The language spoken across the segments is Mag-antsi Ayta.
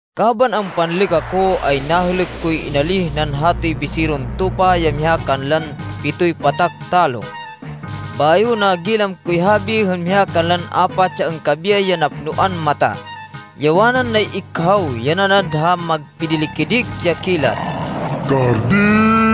Kaban ampanlêk ako, ay nahêlêk koy inalíh nan hatoy Biseron Tupa ya miha kanlan pitoy patak talo. Bayo nagilam koy habi hên miha kanlan apat ya angkabiyay ya napnoan mata, ya wanan nay-ikhaw, ya nanad ha magpidili-kidik ya kilat, “Ka di!”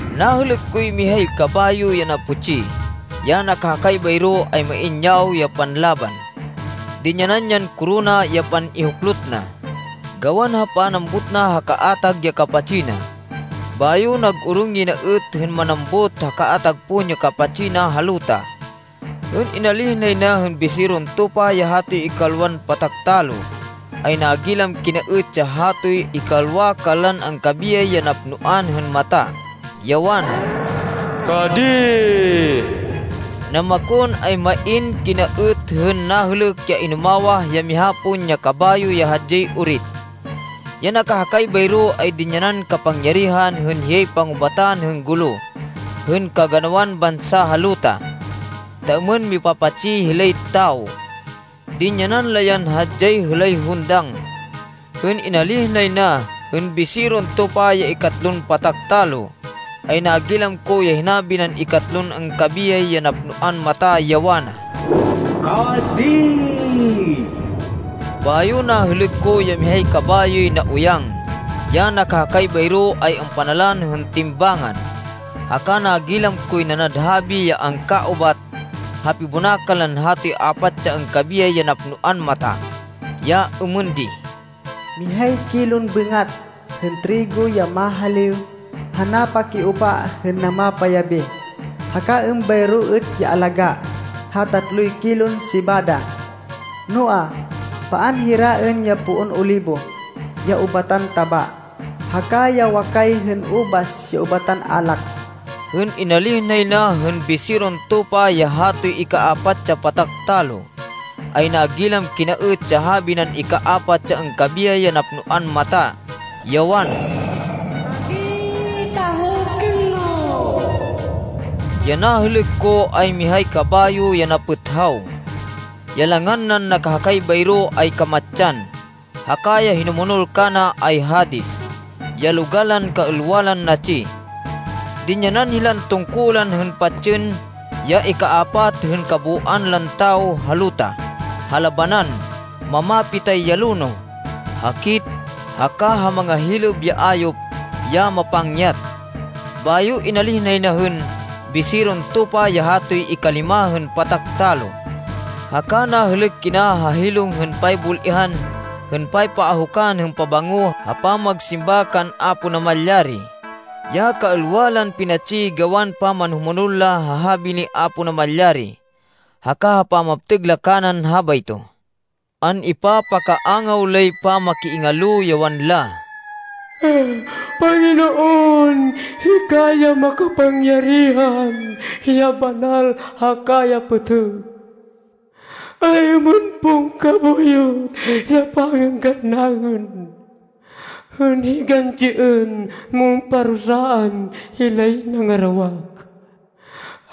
Nahêlêk koy mihay kabayo ya naputsi. Ya nakahakay bayro, ay main yawo ya panlaban. Dinyanan yan korona ya pan-ihuklot na, gawan ha panambut na ha kaatag ya kapatsi na, bayo nag-orong yay na êt hên manambut ha kaatag pon ya kapatsi na ha luta. Hên inalíh nay na hên Biseron Tupa ya hatoy ikalwan patak talo, ay nagilam kina êt ya hatoy ikalwa kanlan angkabiyay ya napnoan hên mata, ya wana, “Ka di!” Namakon, ay main kina êt hên nahêlêk ya inumawah ya miha pon ya kabayo ya hadyay orit. Ya nakahakay bayro, ay dinyanan kapangyarihan hên hiyay pangubatan hên gulo hên kaganawan bansa ha luta ta êmên mipa-patsi hilay tawo. Dinyanan la yan hadyay hêlay hundang. Hên inalíh nay na hên Biseron Tupa ya ikatlon patak talo, ay nagilam ko ya hinabi nan ikatlon angkabiyay ya napnoan mata, ya wana, “Ka di!” Bayo nahêlêk ko ya mihay kabayoy nauyang. Ya nakahakay bayro ay ampanalan hên timbangan. Haka nagilam koy nanad habi ya angkaubat ha pibonakan lan hatoy apat ya angkabiyay ya napnoan mata, ya êmên di: “Mihay kilon bêngat hên trigo ya mahaliw ha napakiupa hên namapayabi, haka êmbayro êt ya alagá ha tatloy kilon sebada. Noa, paan hiraên ya poon olibo, ya ubatan taba, haka ya wakay hên ubas ya ubatan alak.” Hên inalíh nay na hên Biseron Tupa ya hatoy ikapat ya patak talo, ay nagilam kina êt ya habi nan ikapat ya angkabiyay ya napnoan mata, ya wana, “Ka di, ta hêlkên mo!” Ya nahêlêk ko ay mihay kabayo ya napêthaw. Ya langan nan nakahakay bayro ay Kamatsan haka ya hinumonol kana ay Hades, ya logal lan kaêlwa lan natsi. Dinyanan hilan tungkulan hên patsên ya ikapat hên kabooan lan tawo ha luta ha labanan, mamapitay ya lonoh, hakit, haka ha mangahilêb ya ayop ya mapangyat. Bayo inalíh nay na hên Biseron Tupa ya hatoy ikalima hên patak talo. Haka nahêlêk kina ha hilong hên paybul-ihan hên paypaahukan hên pabango ha pamagsimba kan Apo Namalyari, ya kaêlwa lan pinatsi gawan pamanhumonol la ha habi ni Apo Namalyari, haka ha pamaptêg la kanan habayto. An-ipapakaangaw lay pamakiingalo, ya wanla, “Panginoon, hika ya makapangyarihan, ya banal, haka ya pêtêg! Ay-êmên pon kabuyot ya pangênggan naên hên higantsiên mon parusaan hilay nangarawak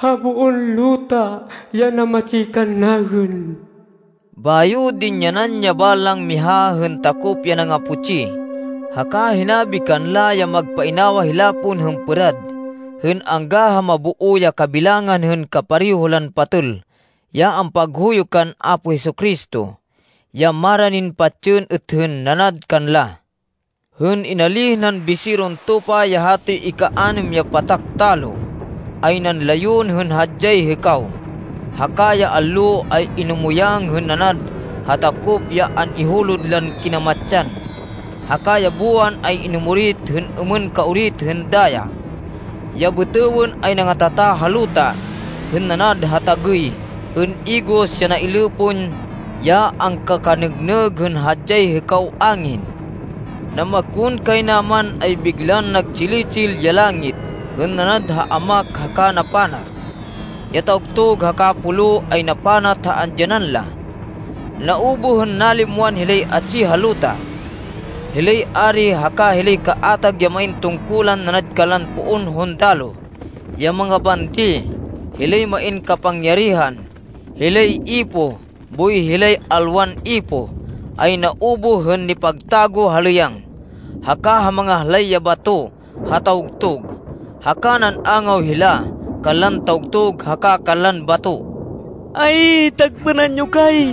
ha boon luta ya namatsi kannaên?” Bayo dinyanan ya balang miha hên takop ya nangaputsi, haka hinabi kanla ya magpainawa hila pon hên pêrad, hên angga ha maboo ya kabilangan hên kapareho lan patêl, ya ampaghuyo kan Apo Jesu-Cristo, ya maranin patsên êt hên nanad kanla. Hên inalíh nan Biseron Tupa ya hatoy ikanêm ya patak talo, ay nanlayon hên hadyay hêkaw, haka ya allo ay inumuyang hên nanad ha takop ya an-ihulod lan kinamatsan. Haka ya buwan ay inumorit hên êmên kaorit hên daya. Ya bêtêwên ay nangatata ha luta hên nanad ha tagêy hên igos ya nailê pon ya angkakanêgnêg hên hadyay hêkaw angin. Namakonkaynaman ay biglan nagtsili-tsil ya langit hên nanad ha amak haka napanat. Ya tawgtug haka pulo ay napanat ha andyanan la. Naubuh hên nalimwan hilay atsi ha luta. Hilay ari haka hilay kaatag ya main tungkulan nanad kanlan poon hundaloh, ya mangabandi, hilay main kapangyarihan, hilay ipoh boy hilay alwan ipoh, ay naubuh hên nipagtago ha lêyang, haka ha mangahlay ya bato ha tawgtug. Haka nan-angaw hila kanlan tawgtug haka kanlan bato, “Ay, tagpênan yo kay,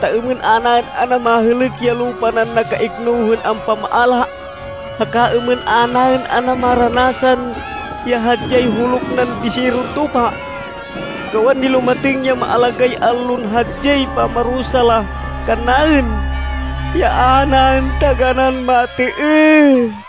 ta êmên a naên ana mahêlêk ya lupa nan nakaikno hên ampamaala, haka êmên a naên ana maranasan ya hadyay huluk nan Biseron Tupa! Gawan nilumatêng ya maalagáy allon hadyay pamarusa la kannaên, ya a naên taganán matêêh!”